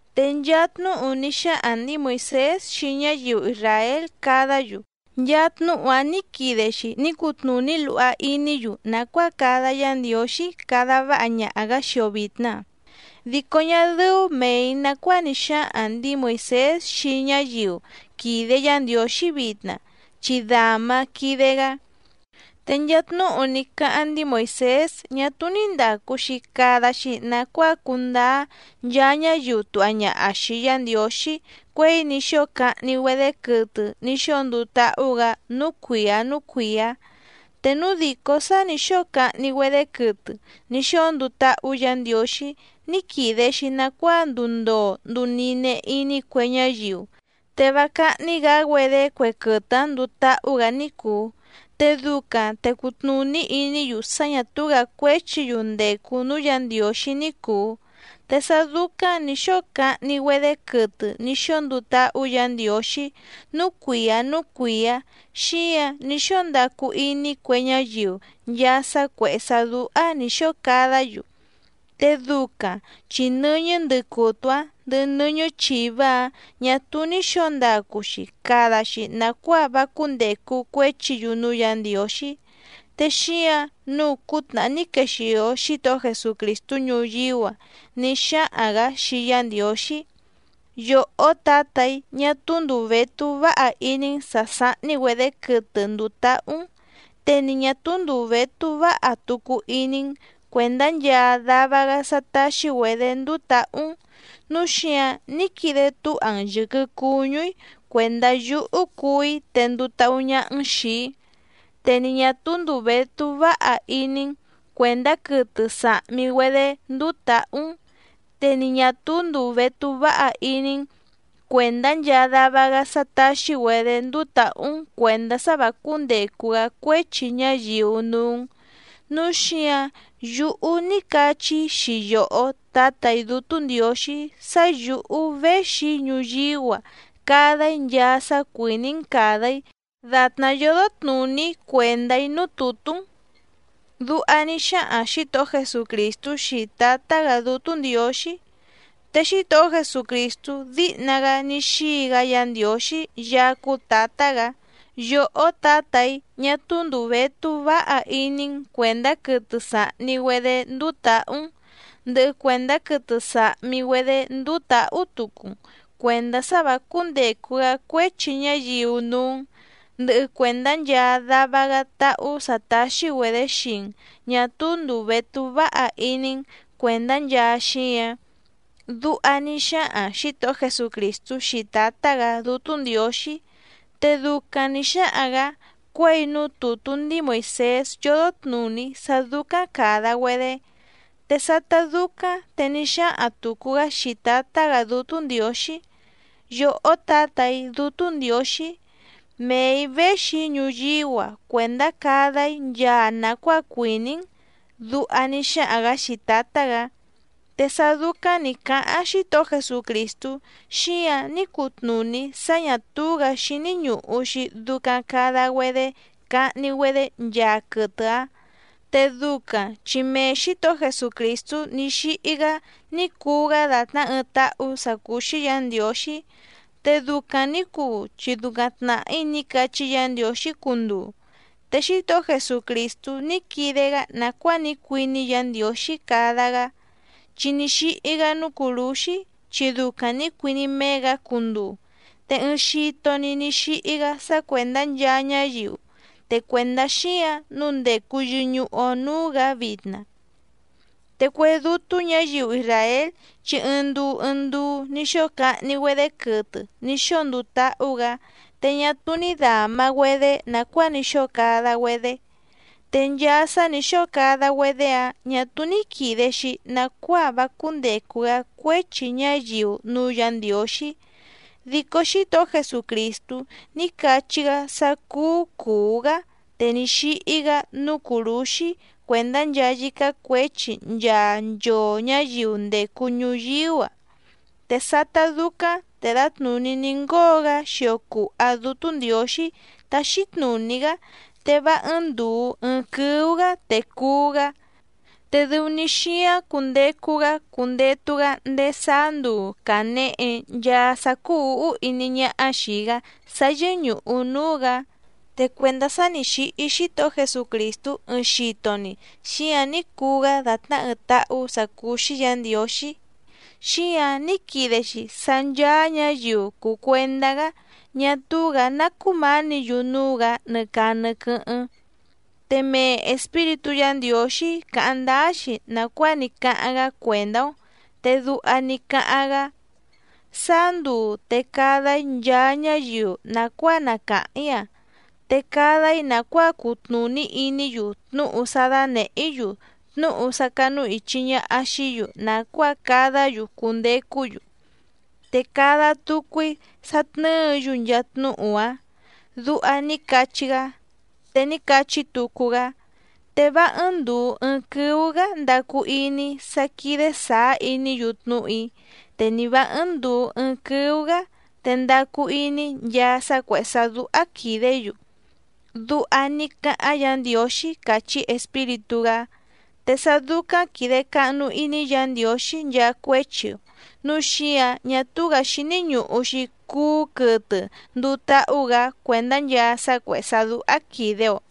Te nchaa tnúhu ní xáhaⁿ ndǐi Moìsés xii ñáyiu isràél cadá‑yu, nchaa tnúhu‑áⁿ nǐ quide‑xi ní cutnùní luha iní‑yu nàcuáa cada Yá Ndiǒxí cada váha ñaha‑gǎ xii‑o vìtna. Dico ñá dɨ́ú mèi nacuáa ní xáhaⁿ ndǐi Moìsés xii ñáyiu quìde Yá Ndiǒxí vitna chi dǎma quìde‑gá. Te nchaa tnúhu ní cáháⁿ ndíi Moìsés ñá túú ní ndàcu‑xi cada‑xi nacuáa cundáá nchaa ñáyiu tùha ñaha xii Yá Ndiǒxí cuěi ní xóo cahni‑güedé quɨtɨ ní xóo nduu táhú‑gǎ núú cuìá núú cuìá. Te núu dìcó sá nǐ xóo cahni‑güedé quɨtɨ ní xóo nduu táhú Yǎ Ndiǒxí ní quìde‑xi nacuáa nduu ndoo nduu nine iní cue ñáyiu, te vá cáhní‑gǎ‑güedé cue quɨtɨ‑áⁿ nduu táhú‑gǎ ní cùu, te ducaⁿ te cutnùní iní‑yu sá ñà túú‑gǎ cuéchi‑yu ndècu núú Yǎ Ndiǒxí ní cùu. Te sá dúcáⁿ nǐ xóo cahni‑güedé quɨtɨ ní xóo nduu táhú Yǎ Ndiǒxí núú cuìá núú cuìá, xíǎⁿ ní xóo ndacu iní cue ñáyiu nchaa sá cuèhé sá dúhá nǐ xóo cadá‑yu. Te ducaⁿ chi nɨ́ñɨ́ ndɨcutu‑áⁿ ndɨhɨ nɨ́ñɨ́ chìvá‑áⁿ ñà túú ní xǒo ndacu‑xi cada‑xi nàcuáa vá cúndècu cuéchi‑yu núú Yǎ Ndiǒxí. Te xíǎⁿ nǔu cútnàhá ní quexìo Xítohó Jesucrìstú ñuyíú‑a ní xáhaⁿ‑gǎ xii Yá Ndiǒxí: Yòhó Tǎtà‑í, ñá túú ndùu vétú váha iní‑n sǎ sáhní‑güedě quɨtɨ ndùu táhú‑n, te ni ñǎ túú ndùu vétú váha tucu iní‑n cuèndá nchaa dava‑gá sá táxí‑güedě ndúú tǎhú‑n, núu xíǎⁿ ní quide túha‑n yɨ̀quɨ cuñú‑í cuèndá yúhú cuú‑í te nduu táhú ñáhá‑n xìi‑í. Te ni ñà túú ndùu vétú váha iní‑n cuèndá quɨtɨ sàhmi‑güedé ndúú tǎhú‑n te ni ñà túú ndùu vétú váha iní‑n cuèndá nchaa dava‑gá sá táxí‑güedě ndúú tǎhú‑n cuèndá sá vǎ cúndècu‑gá cuéchi ñáyiu núú‑n. Núu xíǎⁿ yúhú ní cachí‑í xii yòhó Tǎtà‑í Dútú Ndiǒxí sá yǔhú véxi‑í ñuyíú‑a cada‑í nchaa sá cuìní‑n càda‑í dàtná yódó tnùní cuèndá‑í núú tùtú‑n. Duha ní xáhaⁿ Xǐtohó Jesucrìstú xii Tǎtá‑gǎ Dútú Ndiǒxí. Te Xítohó Jesucrìstú díhna‑gá ní xíi‑gá Yǎ Ndiǒxí Yaá cúú Tǎtá‑gǎ: “Yòhó Tǎtà‑í ñá túú ndùu vétú váha iní‑n cuèndá quɨtɨ sàhni‑güedé ndúú tǎhú‑n, ndɨhɨ cuèndá quɨtɨ sàhmi‑güedé ndúú tǎhú tucu‑n cuèndá sá vǎ cúndècu‑gá cuéchi ñáyiu núú‑n, ndɨhɨ cuèndá nchaa dava‑gá táhú sǎ táxí‑güedě xii‑n ñà túú ndùu vétú váha iní‑n cuèndá nchaa xíǎⁿ”, duha ní xáhaⁿ Xǐtohó Jesucrìstú xii Tǎtá‑gǎ Dútú Ndiǒxí. Te ducaⁿ nǐ xáhaⁿ‑gǎ cuěi núú tùtú ndíi Moìsés yódó tnùní sá dúcáⁿ càda‑güedé. Te sátá dúcáⁿ te ní xáhaⁿ tùcu‑gá xii Tǎtá‑gǎ Dútú Ndiǒxí: “Yòhó Tǎtà‑í Dútú Ndiǒxí, mee‑ǐ véxi‑í ñuyíú‑a cuèndá cada‑í nchaa nàcuáa cuìní‑n”, duha ní xáhaⁿ‑gǎ xii Tǎtá‑gǎ. Te sá dúcáⁿ nì cáháⁿ Xítohó Jesucrìstú xíǎⁿ ní cutnùní sá ñà túú‑gǎ xíní ñùhu‑xi ducaⁿ cada‑güedé cahni‑güedé nchaa quɨtɨ‑áⁿ, te ducaⁿ chi mee Xǐtohó Jesucrìstú ní xíhí‑gá ní cuu‑gá dàtná ɨɨⁿ táhú sǎ cúú‑xí Yǎ Ndiǒxí, te ducaⁿ nǐ cuu chi ducaⁿ tnàhí ní cachí Yǎ Ndiǒxí cunduu. Te Xítohó Jesucrìstú ní quide‑gá nàcuáa ní cuiní Yǎ Ndiǒxí cada‑gá, chi ní xíhí‑gá núú cùrúxí chi ducaⁿ nǐ cuiní méé‑gǎ cunduu, te ɨɨⁿ xito‑ni ní xíhí‑gá sá cuèndá nchaa ñáyiu, te cuèndá xíǎⁿ nǔu ndècu yɨñuhu‑o núú‑gǎ vitna. Te cue dútú ñǎyiu isràél chi ɨɨⁿ nduu ɨɨⁿ nduu ní xóo cahni‑güedé quɨtɨ ní xóo nduu táhú‑gǎ, te ñá túú ní dàma‑güedé nàcuáa ní xóo cada‑güedé. Te nchaa sá nǐ xóo cada‑güedé‑áⁿ ñà túú ní quìde‑xi nacuáa vá cúndècu‑gá cuéchi ñáyiu núú Yǎ Ndiǒxí. Dico Xítohó Jesucrìstú ní cachí‑gá sá cúú cùú‑gá, te ní xíhí‑gá núú cùrúxí cuèndá nchaa yícá cuěchi nchaa nchoo ñǎyiu ndècu ñuyíú‑a. Te sátá dúcáⁿ te dǎtnùní ní ngóo‑gá xio cùha Dútú Ndiǒxí táxí tnùní‑gá, te vá ɨ́ɨ́ⁿ ndùu ɨɨⁿ quɨ́ú‑gǎ te cuú‑gá. Te dɨu‑ni xíáⁿ cundecu‑gá cundetu‑gá ndéé sáá nduu cànehe nchaa sá cúú ǔhú iní ñáhá xìi‑gá sá yɨ́ñùhu núú‑gǎ. Te cuèndá sá nǐ xíhí Xítohó Jesucrìstú ɨɨⁿ xito‑ni xíǎⁿ ní cuu‑gá dàtná ɨɨⁿ táhú sǎ cúú‑xí Yǎ Ndiǒxí, xíǎⁿ ní quide‑xi sá ncháá ñǎyiu cùu cuendá‑gá ñá túú‑gǎ ná cumánǐ‑yu núú‑gǎ nɨ caa nɨ quɨ́hɨ́ⁿ. Te mee Espíritú Yǎ Ndiǒxí càháⁿ ndáá‑xi nàcuáa ní cáháⁿ‑gá cuèndá‑ó, te duha ní cáháⁿ‑gá: Sáá nduu te cada‑í nchaa ñáyiu nàcuáa na càháⁿ‑í‑a, te cada‑í nàcuáa cutnùní iní‑yu tnúhu sá dánèhé‑í‑yu tnúhu sá cánúìchi ñaha xií‑yu nàcuáa cadá‑yu cundecú‑yu, te cada tucu‑í sá tnɨ́ɨ̌‑yu nchaa tnúhu‑áⁿ. Duha ní cachí‑gá. Te ní cachí tucu‑gá: Te vá ɨ́ɨ́ⁿ ndùu ɨɨⁿ quɨ́ú‑gǎ ndacu iní‑í sá quídé sàá iní‑yu tnúhu‑í, te ni vǎ ɨ́ɨ́ⁿ ndùu ɨɨⁿ quɨ́ú‑gǎ te ndacu iní‑í nchaa sá cuèhé sá dúhá quìdé‑yu. Duha ní cáháⁿ Yǎ Ndiǒxí càchí Espíritú‑gá. Te sá dúcáⁿ quìde cahnu iní Yǎ Ndiǒxí nchaa cuéchi‑o, núu xíǎⁿ ñá túú‑gǎ xíní ñùhu‑xi cuú quɨtɨ nduu táhú‑gǎ cuèndá nchaa sá cuèhé sá dúhá quìde‑o.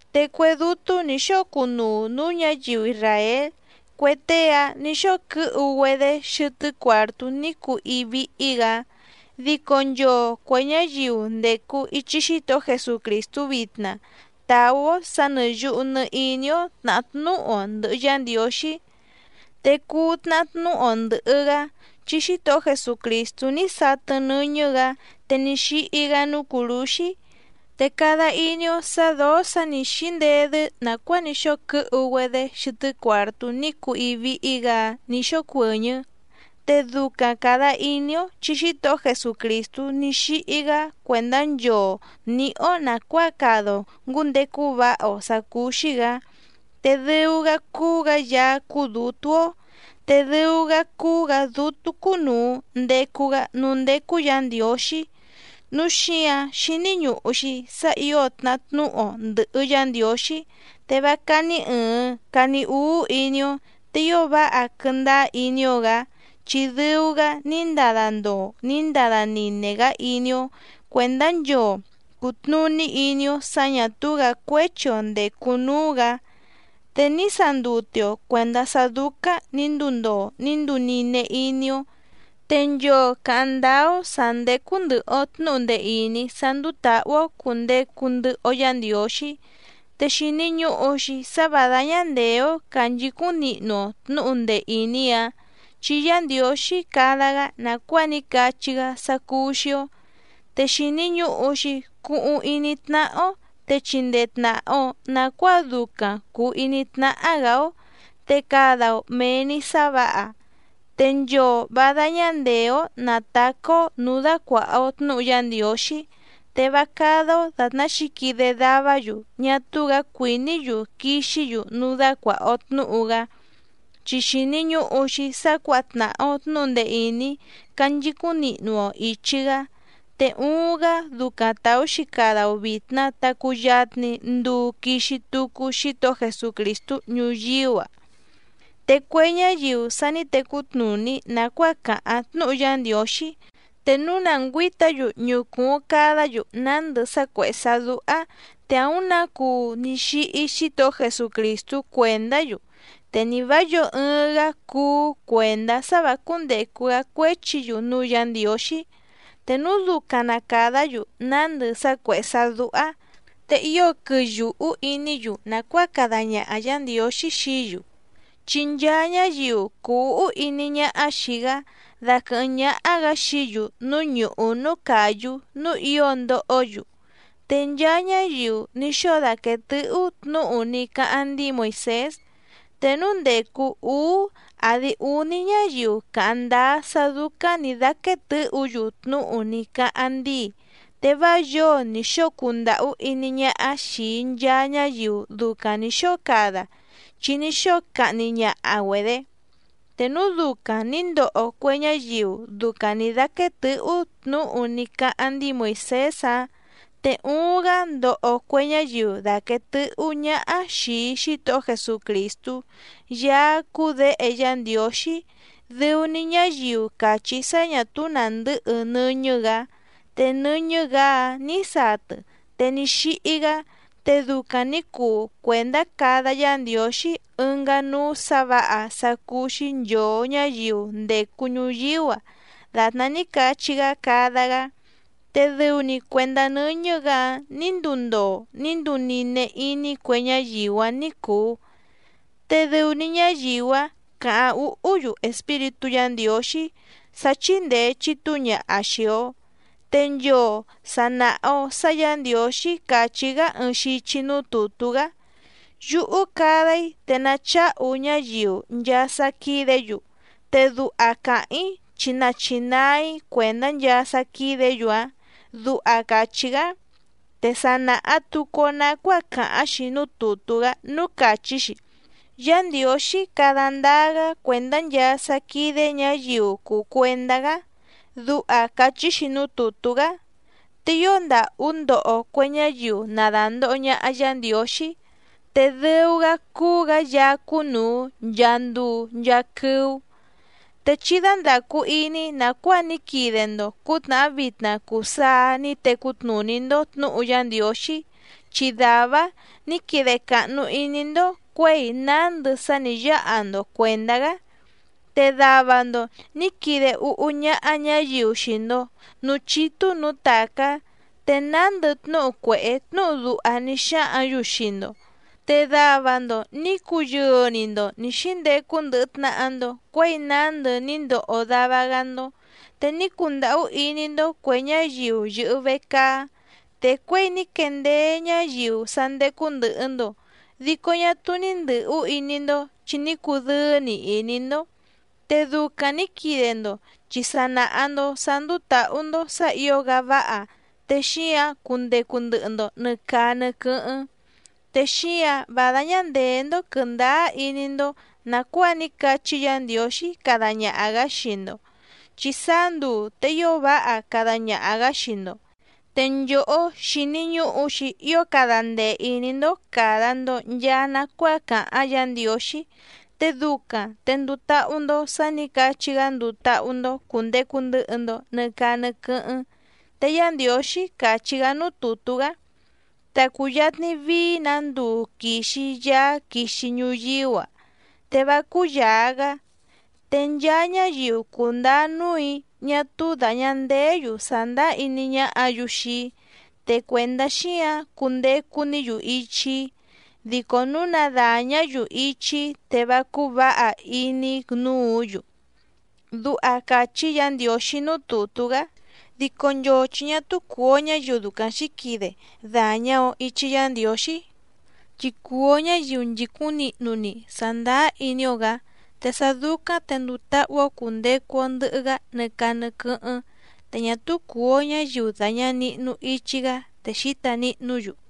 Te cue dútú nǐ xóo cunuu nǔú ñǎyiu isràél cue tée‑áⁿ nǐ xóo quɨ́hu‑güedé xɨtɨ́ cuàrtú ní cuu íí víhí‑gǎ. Dico nchoo cuè ñáyiu ndècu ichi Xítohó Jesucrìstú vitna tàú‑ó sǎ nɨ̀ yuhu nɨ iní‑ó tnàhá tnúhu‑o ndɨ̀hɨ Yá Ndiǒxí. Te cuu tnahá tnúhu‑o ndɨ̀hɨ‑gá chi Xítohó Jesucrìstú ní satɨ nɨ́ñɨ́‑gǎ te ní xíhí‑gá núú cùrúxí. Te cada iní‑ó sǎ dǒó sǎ nǐ xíndedɨ́ nàcuáa ní xóo quɨ́hu‑güedé xɨtɨ́ cuàrtú ní cuu íí víhí‑gǎ‑áⁿ nǐ xócuɨ̀ñɨ́, te ducaⁿ càda iní‑ó chi Xítohó Jesucrìstú ní xíhí‑gá cuèndá nchoo nǐhí‑ó nàcuáa cada‑o ngǔndecu váha‑o sǎ cúú‑xí‑gǎ. Te dɨu‑gá cúú‑gǎ Yaá cúú dǔtú‑ó, te dɨu‑gá cúú‑gǎ Dútú cúnùu ndecu‑gá núú ndécú Yǎ Ndiǒxí. Núu xíǎⁿ xíní ñùhu‑xi sá ǐo tnahá tnúhu‑o ndɨ̀hɨ Yá Ndiǒxí, te vá cání ɨ̀ɨⁿ cani úú iní‑ó, te ío váha quɨndáá iní‑ó‑gǎ chi dɨu‑gá ní ndada ndoo ní ndada nine‑gá iní‑ó cuèndá nchoo cùtnuní iní‑ó sǎ ñà túú‑gǎ cuéchi‑o ndècu núú‑gǎ. Te ní sandute‑o cuèndá sá dúcáⁿ nǐ nduu ndoo ní nduu nine iní‑ó. Te nchoo càháⁿ ndáá‑ó sǎ ndécú ndɨ̀hɨ‑o tnúhu ndee ìní sá ndúú tǎhú‑ó cùndecu ndɨhɨ‑o Yá Ndiǒxí, te xìni ñuhu‑xi sá vǎ dáñá ndèé‑ó cànchicúⁿ nihnu‑o tnǔhu ndee ìní‑áⁿ chi Yá Ndiǒxí cada‑gá nàcuáa ní cachí‑gá sá cúú‑xí‑ó. Te xìni ñuhu‑xi cuhuⁿ iní tnáhá‑ó te chindee tnàha‑o nacuáa ducaⁿ cùu iní tnáhá‑gǎ‑ó, te cada‑o mèe‑ni sá vǎha. Te nchoo vǎ dáñá ndèé‑ó nàtacá‑ó nǔú dácuàha‑o tnúhu Yá Ndiǒxí, te vá cádá‑ó dàtná xǐquide davá‑yu ñá túú‑gǎ cuìní‑yu quixí‑yu núú dácuàha‑o tnúhu‑gá. Chi xìni ñuhu‑xi sá cuǎha tnàha‑o tnúhu ndee ìní canchicúⁿ nihnu‑o ìchi‑gá, te uuⁿ‑gá ducaⁿ tàú‑xi cada‑o vìtna ta cuyatni nduu quixi tucu Xítohó Jesucrìstú ñuyíú‑a. Te cue ñáyiu sa ní tecú tnùní nàcuáa càháⁿ tnúhu Yá Ndiǒxí te núu na ngüǐta‑yu ñucùuⁿ cadá‑yu nándɨ sá cuèhé sá dúhá, te àúⁿ nǎ cuu ní xíhí Xítohó Jesucrìstú cuèndá‑yu, te ni vǎ yǒo ɨɨⁿ‑gá cuú cuèndá sá vǎ cúndècu‑gá cuéchi‑yu núú Yǎ Ndiǒxí. Te núu ducaⁿ na càdá‑yu nándɨ sá cuèhé sá dúhá, te ío quɨyùhú iní‑yu nàcuáa cada ñaha Yǎ Ndiǒxí xií‑yu. Chi nchaa ñáyiu cùu úhú iní ñáhá xìi‑gá daquɨ̀hɨ́ⁿ ñáhá‑gǎ xií‑yu núú ñùhú núú càyú núú ǐo ndohó‑yu. Te nchaa ñáyiu ní xóo daquèe tɨ́hú tnǔhu ní cáháⁿ ndíi Moìsés, te núu ndècu úú àdi úní ñáyiu càháⁿ ndáá sá dúcáⁿ nǐ dáquéé tɨ̌hǔ‑yu tnúhu ní cáháⁿ ndíi, te vá yǒo nì xóo cundàhú iní ñáhá xìi nchaa ñáyiu ducaⁿ nǐ xóo cada chi ní xóo cahni ñaha‑güedě. Te núu ducaⁿ nǐ ndoho cue ñáyiu ducaⁿ nǐ dáquéé tɨ̌hú tnǔhu ní cáháⁿ ndíi Moìsés‑áⁿ, te uuⁿ‑gá ndoho cue ñáyiu dàquee tɨhú ñáhá xìi Xítohó Jesucrìstú Yaá cúú Děhe Yá Ndiǒxí dɨu‑ni ñáyiu càchí sá ñà túú nàndɨ́hɨ nɨ́ñɨ́‑gǎ. Te nɨ́ñɨ́‑gǎ‑áⁿ nǐ satɨ, te ní xíhí‑gá, te ducaⁿ nǐ cuu cuèndá cada Yá Ndiǒxí ɨngá núú sǎ vǎha sá cúú‑xí nchòo ñáyiu ndècu ñuyíú‑a dàtná ní cachí‑gá cada‑gá. Te dɨu‑ni cuèndá nɨ́ñɨ́‑gǎ‑áⁿ nǐ nduu ndoo ní nduu nine iní cue ñáyiu‑áⁿ ní cùu, te dɨu‑ni ñáyiu‑áⁿ càháⁿ úhú‑yu Espíritú Yǎ Ndiǒxí sá chíndèe chitúu ñaha xii‑o. Te nchoo sà naha‑o sá Yǎ Ndiǒxí càchí‑gá ɨɨⁿ xichi núú tùtú‑gá: “Yúhú cada‑í te nacháhu ñáyiu nchaa sá quídě‑yu, te duha càháⁿ‑í chi nachinaa‑í cuèndá nchaa sá quídě‑yu‑áⁿ”, duha càchí‑gá. Te sa nàha tucu‑o nacuáa càháⁿ‑xi núú tùtú‑gá núú càchí‑xi: “Yá Ndiǒxí cada ndáá‑gá cuèndá nchaa sá quídé ñǎyiu cùu cuendá‑gá”, duha càchí‑xi núú tùtú‑gá. ¡Te ío ndàhú ndoho cue ñáyiu na dàndoho ñaha Yá Ndiǒxí, te dɨu‑gá cúú‑gǎ Yaá cúnùu nchaa nduu nchaa quɨ́ú! Te chí dándàcu iní nàcuáa ní quide‑ndo cǔtnàhá vitna cuu saa ní tecú tnùní‑ndó tnǔhu Yá Ndiǒxí, chi dàvá‑áⁿ nǐ quide càhnu iní‑ndó cuěi nándɨ sá nǐ yáha‑ndo cuèndá‑gá. Te dava‑ndo nǐ quide úhú ñáhá ñǎyiu xii‑ndo nǔú chítú nǔú tàcá, te nándɨ tnúhu cuèhé tnúhu duha ní xáhǎⁿ‑yu xii‑ndo. Te dava‑ndo nǐ cuyɨɨ‑ni‑ndo nǐ xíndecu ndɨhɨ tnàha‑ndo cuéi nándɨ ní ndoho dava‑gá‑ndó. Te ní cundàhú iní‑ndó cuè ñáyiu yɨ̀hɨ vecaá, te cuěi ní quendeé ñáyiu sá ndécú ndɨ̀hɨ‑ndo dico ñá túú ní ndɨ̌hú iní‑ndó chi ní cudɨ́ɨ́‑ni iní‑ndó. Te ducaⁿ nǐ quide‑ndo chi sa nàha‑ndo sá ndúú tǎhú‑ndó sǎ ǐo‑gá váha, te xíǎⁿ cundecu ndɨhɨ‑ndo nɨ̀ caa nɨ quɨ́hɨ́ⁿ. Te xíǎⁿ vá dáñá ndèé‑ndó quɨ̀ndáá iní‑ndó nàcuáa ní cachí Yǎ Ndiǒxí cada ñaha‑gǎ xii‑ndo, chi sáá nduu te ío váha cada ñaha‑gǎ xii‑ndo. Te nchòhó xíní ñùhu‑xi ío cada ndee ìní‑ndó càda‑ndo nchaa nacuáa càháⁿ Yǎ Ndiǒxí, te ducaⁿ te nduu táhú‑ndó sǎ nǐ cachí‑gá nduu táhú‑ndó cùndecu ndɨhɨ‑ndo nɨ caa nɨ quɨ́hɨ́ⁿ. Te Yá Ndiǒxí càchí‑gá núú tùtú‑gá: Ta cùyatni vií‑nǎ nduu quìxi Yaá quixi ñuyíú‑a, te vá cúyàa‑gá. Te nchaa ñáyiu cùndáá núù‑í ñá túú dàña ndeé‑yu sàndáá iní ñáhǎ‑yu xii‑í, te cuèndá xíǎⁿ cundecu‑ní‑yu ichi‑í, dico núu na dàñá‑yu ichi‑í te vá cúú vǎha iní‑í núǔ‑yu. Duha càchí Yǎ Ndiǒxí núú tùtú‑gá. Dico nchoo chi ñá túú cùu‑o ñáyiu ducaⁿ xǐquide dàñá‑ó ìchi Yá Ndiǒxí, chi cùu‑o ñáyiu nchìcúⁿ nihnu‑ni sàndáá iní‑ó‑gǎ, te sá dúcáⁿ te nduu táhú‑ó cùndecu‑o ndɨhɨ‑gá nɨ caa nɨ quɨ́hɨ́ⁿ, te ñá túú cùu‑o ñáyiu dàña nihnu ichi‑gá te xǐta nihnú‑yu.